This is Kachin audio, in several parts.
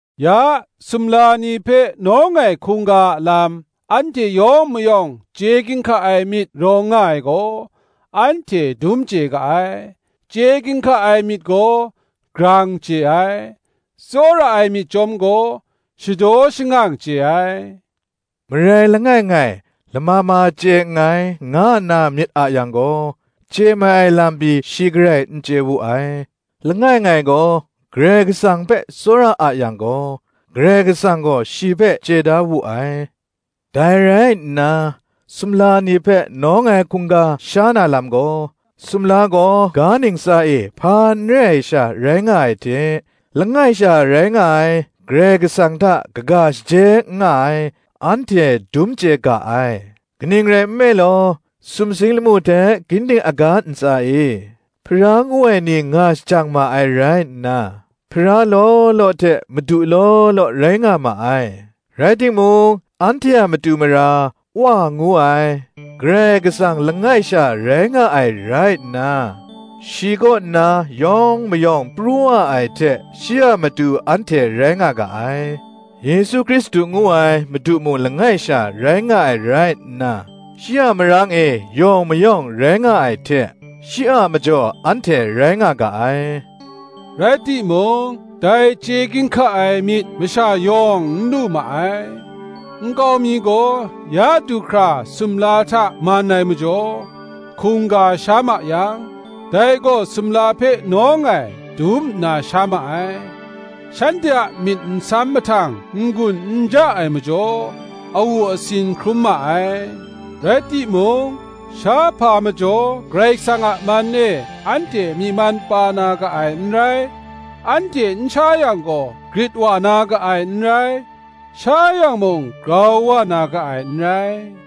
Ya, sumla ni hpe nawng ai hkungga a lam, anhte yawng mayawng chye ginhka ai myit rawng nga ai gaw, anhte dum chye ga ai. Chye ginhka ai myit gaw grang chye ai, tsawra ai myit chyawm gaw, shadaw shangang chye ai. Marai langai ngai, lama ma chye nngai, nga nna myit a yang gaw, chye mai ai lam pyi shi garai n chye wu ai: langai ngai gaw, Karai Kasang hpe tsawra a yang gaw, Karai Kasang gaw shi hpe chye da wu ai. Dai rai nna, sumla ni hpe nawng ai hkungga sha na lam gaw, sumla gaw ga ntsa e hpa n re ai sha rai nga ai hte, langai sha rai nga ai Karai Kasang hta kaga shaje n nga ai, anhte dum chye ga ai. Kaning rai nme law, sumsing lamu hte ginding aga ntsa e, Hpara ngu ai ni nga shajang ma ai rai nna, Hpara law law hte madu law law rai nga ma ai, rai timung, anhte a matu mara, Wa ngu ai, Karai Kasang langai sha rai nga ai rai nna, shi kaw nna yawng mayawng pru wa ai hte, shi a matu anhte rai nga ga ai; Yesu Hkristu ngu ai Madu mung langai sha rai nga ai rai nna, shi a marang e yawng mayawng rai nga ai hte, shi a majaw anhte rai nga ga ai. Rai timung, dai chye ginhka ai myit masha yawng n lu ma ai: nkau mi gaw ya du hkra sumla hta man ai majaw, hkungga sha ma yang, dai gaw sumla hpe nawng ai, dum nna sha ma ai; shanhte a myit nsam mahtang n-gun n ja ai majaw, awu asin hkrum ma ai. Rai timung, shahpa majaw Karai Kasang a man e anhte myi man pa na ga ai n rai: anhte n sha yang gaw, grit wa na ga ai n rai; sha yang mung, grau wa na ga ai n rai.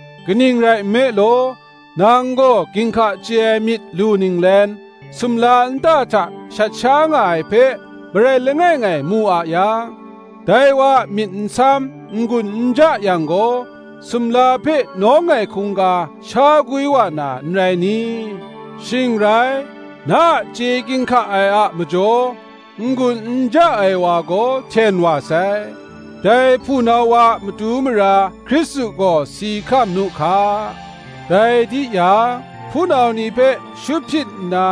Kaning rai nme law, nang gaw ginhka chye ai myit lu ninglen, sumla nta hta shat sha nga ai hpe, marai langai ngai mu a yang, dai wa a myit nsam n-gun n ja yang gaw, sumla hpe nawng ai hkungga sha gwi wa na, n rai ni? Shing rai, na a chye ginhka ai a majaw, n-gun n ja ai wa gaw hten wa sai; dai hpunau wa a matu mara Hkristu gaw si hkam nu hka! Dai di yang, hpunau ni hpe shut hpyit nna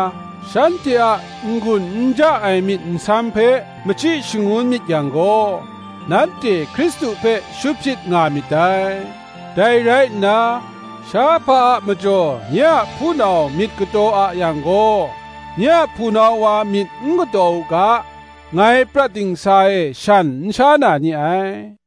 shanhte a n-gun n ja ai myit nsam hpe machyi shangun myit yang gaw, nanhte Hkristu hpe shut hpyit nga myit dai. Dai rai nna, shahpa a majaw nye a hpunau myit kataw a yang gaw, nye a hpunau wa myit n kataw u ga, ngai prat dingsa e shan n sha na ni ai.